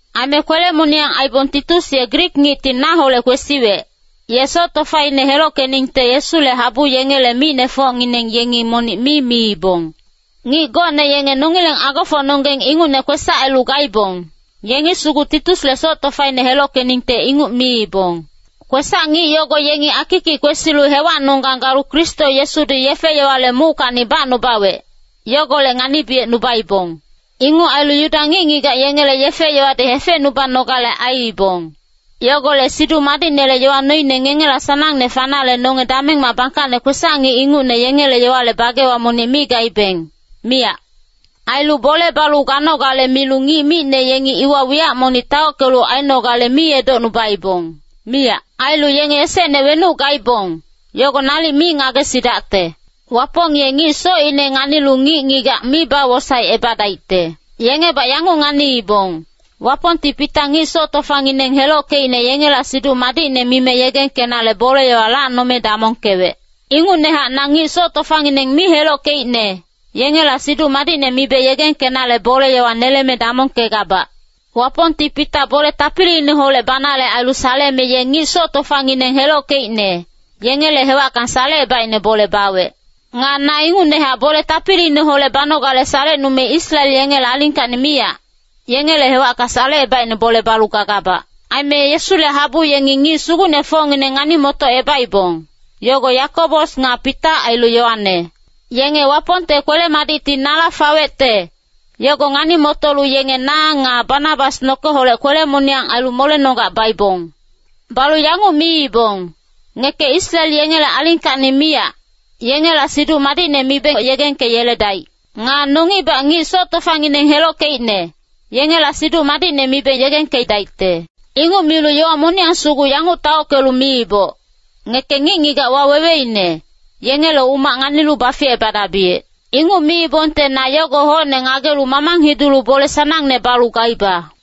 Aime kwele-moniyang aibong Titus ye Grik ngicti naholec kwesiwec, ye soc tofaine helockeningte Yesule habu yengele micnefocngineng yengi monic mi miibong. Ngic gocne yenge nongileng agofocnonggeng ingucne kwesac ailu gaibong, yengi sugu Titusle soc tofaine helockeningte inguc miibong. Kwesac-ngic yogo yengi akikic kwesilu hewacnonggang galu Kristo Yesudi yefe-yowale muckacni bacnubawec, yogolec nganibiyecnubaibong. Inguc ailu Yuda ngic-ngigac yengele yefe-yowadi hefecnubanogale aiibong. Yogolec Siduc Madicnele yowa noine ngengela sanangne fanale nonge damengmac bangkacne kwesac-ngic ingucne yengele yowale bagewa monic mi gaibeng, miyac. Ailu bole balu ganogale milu ngic micne yengi iwa wiyac monic taockelu ainogale mi edocnuibong, miyac. Ailu yenge esecne wenuc gaibong, yogo nalic mi ngagesidacte. Wapong ye ngic socine nganilu ngic-ngigac mi bawosaecebadaicte. Yengebac yanguc nganiibong, Wapongti Pita ngic soc tofangineng helockeicne yengela Siduc Madicne mime yegengkenale bole-yowa lacnome damongkewec. Ingucnehac na ngic soc tofangineng mi helockeicne, yengela Siduc Madicne mibe yegengkenale bole-yowa neleme damongkegabac. Wapongti Pita bole tapiliineholec banale ailu saleme ye ngic soc tofangineng helockeicne, yengele hewacka salecebaicne bole bawec. Nga na ingucnehac bole tapiliineholec banogale salecnume Israel yengele alingkacni miyac, yengele hewacka salecebaicne bole balu gagabac. Aime Yesule habu yengi ngic sugucnefocngineng ngani-motocebaibong, yogo Yakobos nga Pita ailu Yoane. Yenge Wapongte kwele-madicti nala fawecte, yogo ngani-motolu yenge na nga Banabas nokeholec kwele-moniyang ailu molenonggac baibong. Balu yanguc miibong, “Ngeke Israel yengele alingkacni miyac, yengela Siduc Madicne miboc yegengkeyeledaic. Nga nongibac ngic soc tofangineng helockeicne, yengela Siduc Madicne mibeng yegengkedaicte.” Inguc milu yowa moniyang sugu yanguc taockelu miibong, “Ngeke ngic-ngigac waweweine, yengele umac nganilu baficebadabiyec.” Inguc miibongte na yogo hocne ngagelu mamang hidulu bole sanangne balu gaiba.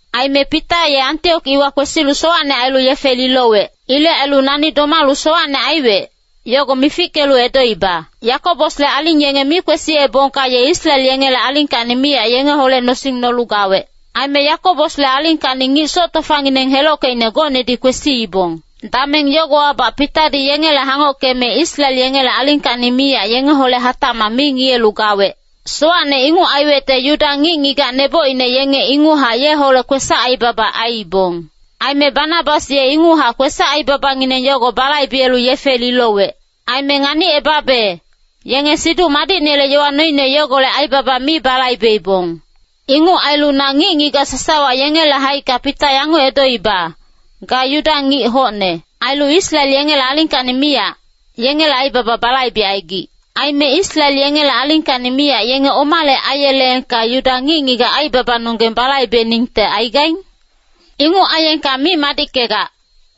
Aime Pita ye Antiok iwa kwesilu sowacne ailu yefe lilowec. Ilec ailu nani domalu sowacne aiwec, yogo mifickelu edoiba. Yakobosle aling yenge mi kwesiyebongka ye Israel yengele alingkacni miyac yengeholec nosing nolu gawec. Aime Yakobosle alingkacni ngic soc tofangineng helockeicne gocnedi kwesiibong. Dameng yogowabac Pitadi yengele hangockeme Israel yengele alingkacni miyac yengeholec hatacmac mi ngiyelu gawec. Sowacne inguc aiwecte Yuda ngic-ngigac nebocine yenge inguchac yeholec kwesac-aibaba aiibong. Aime Banabas ye inguchac kwesac-aibabangineng yogo balaibelu yefe lilowec. Aime nganicebabe, yenge Siduc Madicnele yowa noine yogolec aibaba mi balaibeibong. Inguc ailu na ngic-ngigac sasawa yengele haicka Pita yanguc edoiba, “Ga Yuda ngic hocne. Ailu Israel yengele alingkacni miyac, yengele aibaba balaibecaigic. Aime Israel yengele alingkacni miyac yenge omale aiyeleengka Yuda ngic-ngigac aibabanonggeng balaibeningte aigaing? Inguc aiyengka mi madickegac.”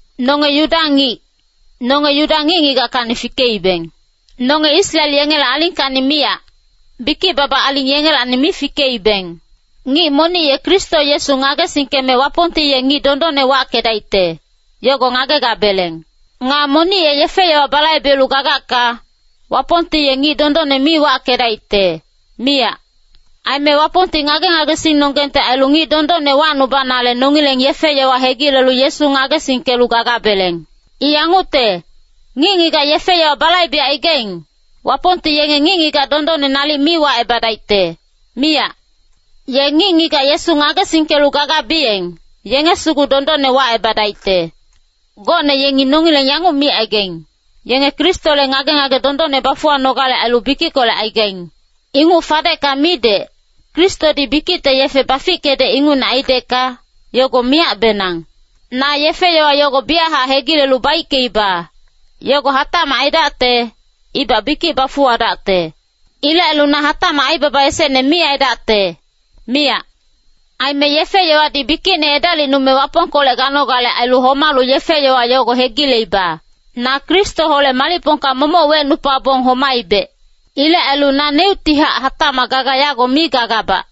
Nonge Yuda ngic, nonge Yuda ngic-ngigackacni fikeibeng. Nonge Israel yengele alingkacni miyac, bikic-baba aling yengelacni mi fikeibeng. Ngic monic ye Kristo Yesu ngagesingkeme Wapongti ye ngic dondonne wackedaicte, yogo ngagegabeleng. Nga monic ye yefe-yowa balaibelu gagacka, Wapongti ye ngic dondonne mi wackedaicte, miyac. Aime Wapongti ngage-ngagesingnonggengte ailu ngic dondonne wacnubanale nongileng yefe-yowa hegilelu Yesu ngagesingkelu gagabeleng. I yangucte, ngic-ngigac yefe-yowa balaibecaigaing, Wapongti yenge ngic-ngigac dondonne nalic mi wacebadaicte, miyac. Ye ngic-ngigac Yesu ngagesingkelu gagabiyeng, yenge sugu dondonne wacebadaicte. Gocne yengi nongileng yanguc micaigaing, “Yenge Kristole ngage-ngage dondonne bafuwanogale ailu bikickolec aigaing.” Inguc fadecka midec, Kristodi bikicte yefe bafickedec ingucne aidecka, yogo miyacbenang! Na yefe-yowa yogo biyachac hegilelu baickeiba, yogo hatacmac aidacte, ibac bikic bafuwadacte. Ilec ailu na hatacmac aibaba esecne mi aidacte, miyac. Aime yefe-yowadi bikicne edalicnume Wapongkolec ganogale ailu homalu yefe-yowa yogo hegileiba. Na Kristoholec malicpongka momoc wecnupabong domaibec. Ilec ailu naneuctihac hatacmac gaga yago mi gagabac.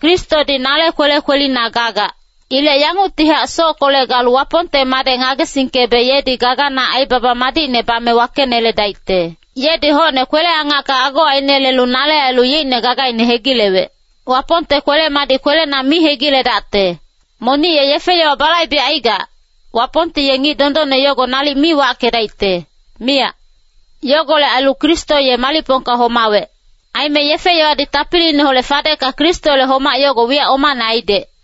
Kristodi nale kwele kwelina gagac. Ilec yanguctihac sockolec galu Wapongte Madec ngagesingkebe yedi gagana aibaba madicne bame wakeneledaicte. Yedi hocne kwele-angacka ago ainelelu nale ailu yeicne gagaine hegilewec. Wapongte kwele-madic kwelena mi hegiledacte. Monic ye yefe-yowa balaibecaigac, Wapongti ye ngic dondonne yogo nalic mi wackedaicte, miyac. Yogolec ailu Kristo ye malicpongka homawec. Aime yefe-yowadi tapiliineholec fadecka Kristole homac yogo wiyac omane aidec.